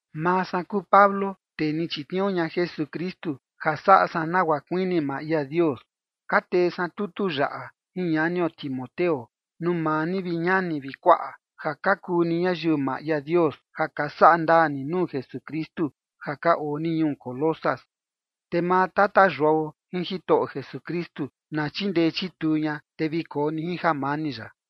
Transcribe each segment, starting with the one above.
Maa san kuu Pablo tee ni chitniuu ña Jesukristu, ja saꞌa san nagua kuini maa ia Dios, ka tee san tutu yaꞌa jin ñanio Timoteo, nuu maa ni, vi ñani vi kuaꞌa, ja ka kuu ni ñayiu maa ia Dios ja ka saꞌa ndaa ni nuu Jesukristu ja ka oo ni ñuu Colosas. Te maa Tata Yuao jin Jitoꞌo Jesukristu na chindee chituu ña, te vi koo ni jin jamani ya.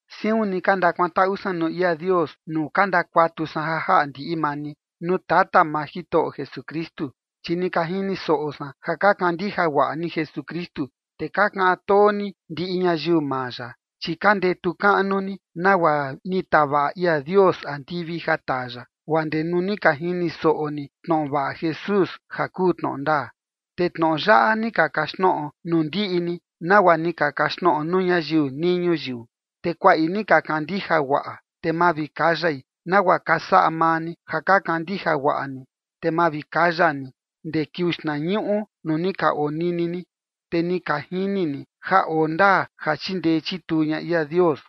Siun ni ka ndakuantaꞌu san nuu ia Dios, nuu ka ndakuatu san ja jaꞌa ndiꞌi maa ni, nuu Tata maa Jitoꞌo Jesukristu, chi ni ka jini soꞌo san ja ka kandija guaꞌa ni Jesukristu, te ka kaꞌan too ni ndiꞌi ñayiu maa ya. Chi ka ndetu kaꞌnu ni nagua ni tavaꞌa ia Dios andivi ja taa ya, guaa ndee nuu ni ka jini soꞌo ni tnoꞌo vaꞌa Jesús ja kuu tnoꞌo ndaa. Te tnoꞌo yaꞌa ni ka kaxtnoꞌo nuu ndiꞌi ni, nagua ni ka kaxtnoꞌo nuu ñayiu nii ñuyiu, te kuaꞌi ni ka kandija guaꞌa, te mavikayai, nagua ka saꞌa maa ni ja ka kandija guaꞌa ni, te mavikaya ni ndee kiuu xtnañuꞌu nuu ni ka onini ni, te ni ka jini ni ja oo ndaa ja chindee chituu ña ia Dios.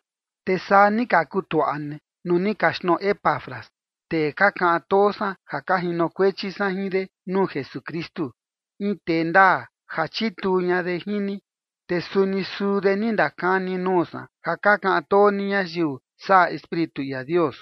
Te saa ni ka kutuaꞌa ni nuu ni kaxtnoꞌo Epafras, tee ka kaꞌan too san ja ka jinokuechi san jin de nuu Jesukristu, in tee ndaa ja chituu ña de jin ni, te suni suu de ni ndakani nuu san ja ka kaꞌan too ni ñayiu saꞌa Espíritu ia Dios.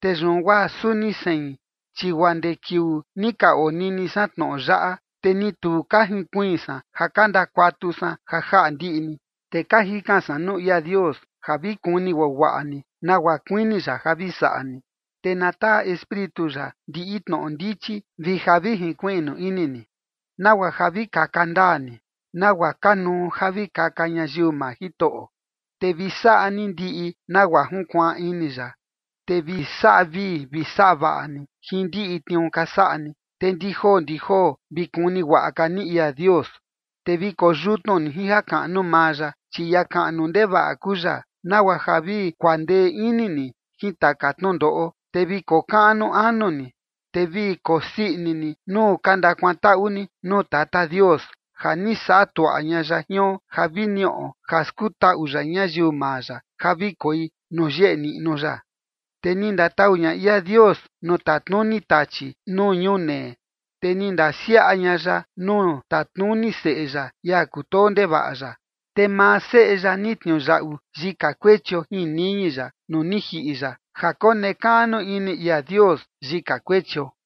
Te yun guaa suni sein, chi guaa ndee kiuu ni ka onini san tnoꞌo yaꞌa, te ni tu ka jinkuiin san ja ka ndakuatu san ja jaꞌa ndiꞌi ni. Te ka jikan san nuu ia Dios ja vi kuni guaguaꞌa ni nagua kuini ya ja vi saꞌa ni, te na taa Espíritu ya ndiꞌi tnoꞌo ndichi vi ja vi jinkuiꞌnu ini ni, nagua ja vi kaka ndaa ni, nagua kanuu ja vi kaka ñayiu maa Jitoꞌo, te vi saꞌa ni ndiꞌi nagua junkuaan ini ya, te vi saꞌa vii vi saꞌa vaꞌa ni jin ndiꞌi tniuu ka saꞌa ni, te ndi joo ndi joo vi kuni guaꞌa ka ni ia Dios. Te vi koyutnu ni jin jakaꞌnu maa ya, chi ia kaꞌnu ndevaꞌa kuu ya, nagua ja vi kuandee ini ni jin taka tnundoꞌo, te vi kokaꞌnu anu ni. Te vi kosii ini ni nuu ka ndakuantaꞌu ni nuu Tata Dios, ja ni saꞌa tuaꞌa ña ya jion ja vi niꞌo ja skutaꞌu ya ñayiu maa ya ja vi koi nuu yeꞌe niꞌnu ya. Te ni ndatau ña ia Dios nuu tatnuni Tachi nuu ñunee, te ni ndasiaꞌa ña ya nuu tatnuni Seꞌe ya, ia kutoo ndevaꞌa ya. Te maa Seꞌe ya ni tniuyaꞌu yika kuechio jin niñi ya nuu ni jiꞌi ya ja konekaꞌnu ini ia Dios yika kuechio.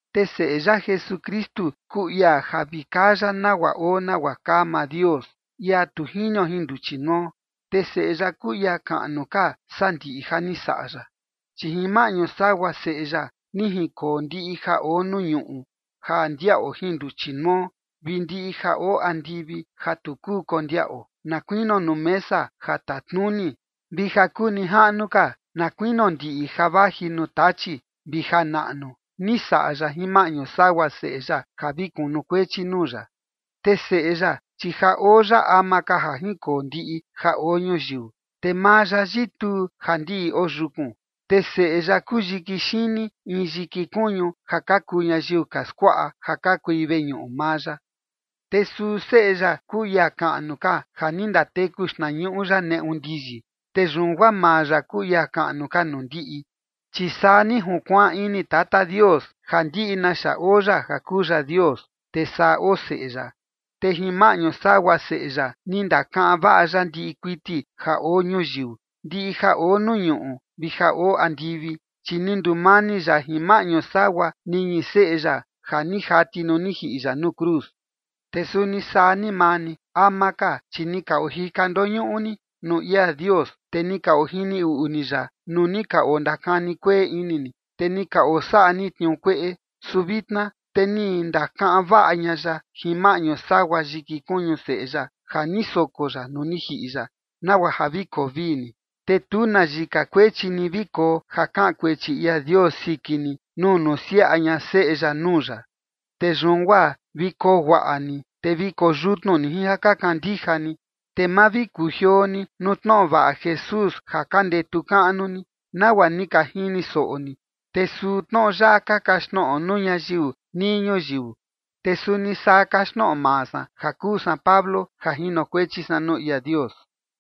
Te Seꞌe ya Jesukristu kuu ia ja vi kaa ya nagua oo nagua kaa maa Dios, ia tu jinio jin nduchi nuo, te Seꞌe ya kuu ia kaꞌnu ka saa ndiꞌi ja ni saꞌa ya. Chi jin maꞌñu sagua Seꞌe ya ni jinkoo ndiꞌi ja oo nuu ñuꞌu ja ndiaꞌo jin nduchi nuo, vi ndiꞌi ja oo andivi ja tu kuu kondiaꞌo, na kuinio nuu mesa ja tatnuni, vi ja kuu nijaꞌnu ka na kuinio ndiꞌi ja vaji nuu Tachi vi ja naꞌnu, ni saꞌa ya jin maꞌñu sagua Seꞌe ya ja vi kunukuechi nuu ya. Te Seꞌe ya, chi ja oo ya ama ka ja jinkoo ndiꞌi ja oo ñuyiu, te maa ya yituu ja ndiꞌi oo yukun. Te Seꞌe ya kuu yiki xini in yiki kuñu ja ka kuu ñayiu ka skuaꞌa ja ka kui veñuꞌu maa ya. Te suu Seꞌe ya kuu ia kaꞌnu ka ja ni ndateku xtnañuꞌu ya neꞌu ndiyi, te yun guaa maa ya kuu ia kaꞌnu ka nuu ndiꞌi. Chi saa ni junkuaan ini Tata Dios ja ndiꞌi naxa oo ya ja kuu ya Dios, te saa oo Seꞌe ya. Te jin maꞌñu sagua Seꞌe ya ni ndakaꞌan vaꞌa ya ndiꞌi kuiti ja oo ñuyiu, ndiꞌi ja oo nuu ñuꞌu vi ja oo andivi, chi ni ndumani ya jin maꞌñu sagua niñi Seꞌe ya ja ni jati nuu ni jiꞌi ya nuu cruz. Te suni saa ni maa ni, ama ka, chi ni ka ojika ndoñuꞌu ni nuu ia Dios, te ni ka ojini uꞌu ni ya nuu ni ka ondakani kueꞌe ini ni, te ni ka osaꞌa ni tniuu kueꞌe, su vitna te ni ndakaꞌan vaꞌa ña ya jin maꞌñu sagua yiki kuñu Seꞌe ya ja ni soko ya nuu ni jiꞌi ya, nagua ja vi koo vii ni, te tu na yika kuechi ni vi koo ja kaꞌan kuechi ia Dios siki ni nuu nusiaꞌa ña Seꞌe ya nuu ya. Te yun guaa vi koo guaꞌa ni, te vi koo yutnu ni jin ja ka kandija ni, te ma vi kujioo ni nuu tnoꞌo vaꞌa Jesús ja ka ndetu kaꞌnu ni, nagua ni ka jini soꞌo ni. Te suu tnoꞌo yaꞌa ka kaxtnoꞌo nuu ñayiu nii ñuyiu, te suni saa kaxtnoꞌo maa san ja kuu san Pablo ja jinokuechi san nuu ia Dios.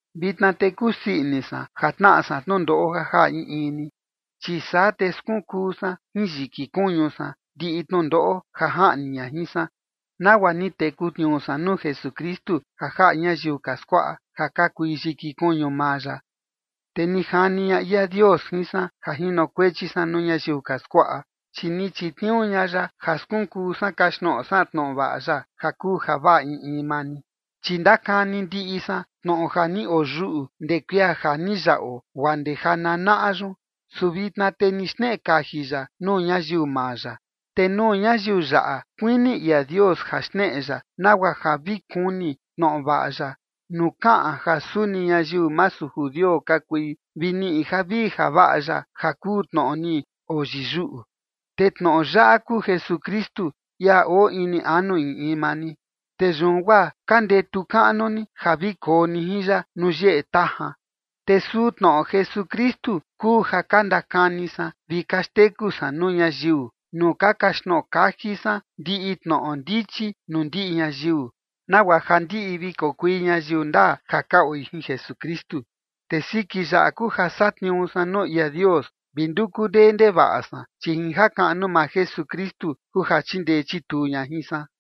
Vitna te kusii ini san ja tnaꞌa san tnundoꞌo ja jaꞌa in in ni, chi saa te skunkuu san jin yiki kuñu san ndiꞌi tnundoꞌo ja jaꞌni ña jin san, nagua ni teku tniuu san nuu Jesukristu ja jaꞌa ñayiu ka skuaꞌa ja ka kui yiki kuñu maa ya. Te ni jani ña ia Dios jin san ja jinokuechi san nuu ñayiu ka skuaꞌa, chi ni chitniuu ña ya ja skunkuu san kaxtnoꞌo san tnoꞌo vaꞌa ya, ja kuu javaꞌa in in maa ni. Chi ndakani ndiꞌi san tnoꞌo ja ni oyuꞌu ndee kuia ja ni yaꞌo guaa ndee ja nanaꞌa yun, su vitna te ni xneꞌe kaji ya nuu ñayiu maa ya. Te nuu ñayiu yaꞌa kuini ia Dios ja xneꞌe ya nagua ja vi kuni tnoꞌo vaꞌa ya nuu kaꞌan ja suni ñayiu masu judio ka kui vi niꞌi javii javaꞌa ya ja kuu tnoꞌo ni oyiyuꞌu, te tnoꞌo yaꞌa kuu Jesukristu, ia oo ini anu in in maa ni. Te yun guaa ka ndetu kaꞌnu ni ja vi koo ni jin ya nuu yeꞌe tajan. Te suu tnoꞌo Jesukristu kuu ja ka ndakani san vi ka xteku san nuu ñayiu nuu ka kaxtnoꞌo kaji san ndiꞌi tnoꞌo ndichi nuu ndiꞌi ñayiu, nagua ja ndiꞌi vi kokui ñayiu ndaa ja ka oi jin Jesukristu. Te siki yaꞌa kuu ja satniuu san nuu ia Dios vi nduku ndee ndevaꞌa san, chi jin jakaꞌnu maa Jesukristu kuu ja chindee chituu ña jin san.